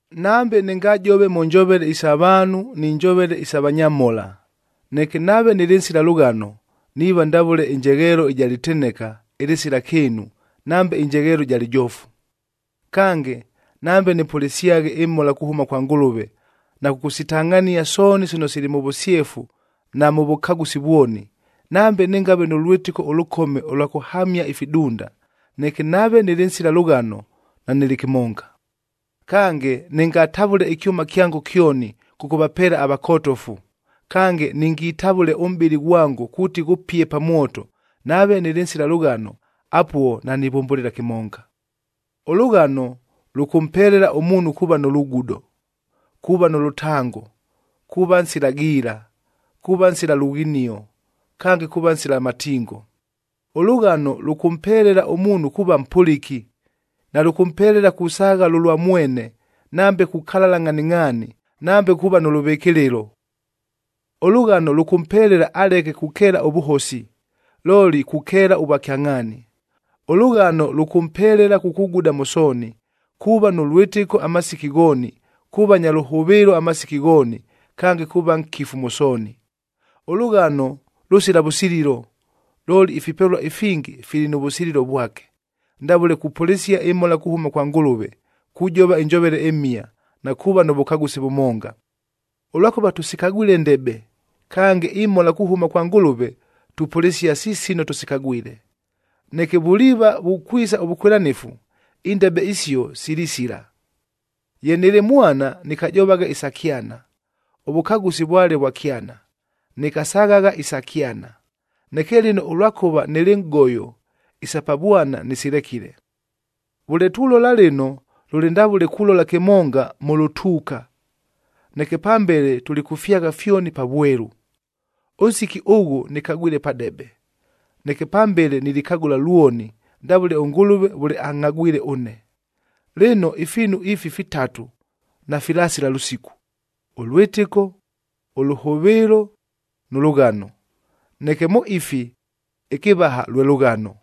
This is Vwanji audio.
Nambe nɨngajove mʉ njovele isa vaanhu ni njovele isa vanyamhola, neke nave nɨlɨ nsila lʉghano, niiva ndavʉle ɨnjegheelo ɨja lɨteneka ɨlɨsila kɨɨnu nambe ɨnjegheelo ɨja lɨjoofu. Kange, nambe nɨpʉlɨsyaghe ɨmhola kuhʉma kwa Ngʉlʉve na kʉkʉsitangʼhania sooni sino sili mʉ vʉsyefu na mʉ vʉkagʉsi vwoni, nambe nɨngave nʉ lwɨtɨko ʉlʉkome ʉlwa kʉhamia ifidunda, neke nave nɨlɨ nsila lʉghano, nanɨlɨ kɨmonga. Kange, nɨngatavʉle ɨkyʉma kyango kyoni kʉkʉvapeela avakotofu, kange ningitavʉle ʉmʼbɨlɨ ghwango kuuti ghʉpie pa mwoto, nave nɨlɨ nsila lʉghano, apuo nanivʉmbʉlɨla kɨmonga. Ʉlʉghano lʉkʉmpelela ʉmuunhu kuuva nʉ lugudo, kuuva nʉ lʉtango, kuuva nsila giila, kuuva nsila lughinio, kange kuuva nsila matingo. Ʉlʉghano lʉkʉmpelela ʉmuunhu kuuva mpʉlɨki, nalʉkʉmpelela kusaagha lʉlwa mwene, nambe kukalala ngʼhaningʼhaani, nambe kuuva nʉ lʉvɨkɨlɨlo. Ʉlʉghano lʉkʉmpelela aleke kukeela ʉvʉhosi, looli kukeela ʉvwakyangʼhaani. Ʉlʉghano lʉkʉmpelela kukuguda mʉ sooni, kuuva nʉ lwɨtɨko amasiki ghooni, kuuva nya lʉhʉvɨɨlo amasiki ghooni, kange kuuva nkifu mʉ sooni. Ʉlʉghano lʉsila vʉsililo, looli ifipelua ifingi fili nʉ vʉsililo vwake, ndavʉle kupʉlɨsia ɨmhola kuhʉma kwa Ngʉlʉve, kujova ɨnjovele ɨmhia, na kuuva nʉ vʉkagʉsi vʉmonga. Ʉlwakʉva tʉsikagwile ndebe, kange imhola kuhʉma kwa Ngʉlʉve tupʉlɨsia si sino tʉsikagwile. Neke vuliiva vukwisa ʉvʉkwɨlanɨfu, indebe isio silisila. Ye nɨlɨ mwana, nɨkajovagha isa kyana, ʉvʉkagʉsi vwale vwa kyana, nɨkasaghagha isa kyana. Neke lɨno ʉlwakʉva nɨlɨ nʼgoyo, isa pa vwana nɨsilekile. Vʉle tulola lɨno, lʉlɨ ndavʉle kulola kɨmonga mʉ lʉtuuka, neke pambele tulikʉfyagha fyoni pa vwelu. Ʉnsiki ʉghʉ nɨkagwile padebe, neke pambele nilikagʉla lwoni ndavʉle ʉNgʉlʉve vʉle angʼhagwile ʉne. Lɨno, ifiinu ifi fitatu nafilasila lʉsiku: ʉlwɨtɨko, ʉlʉhʉvɨɨlo nʉ lʉghano. Neke mʉ ifi, ɨkɨvaha lwe lʉghano.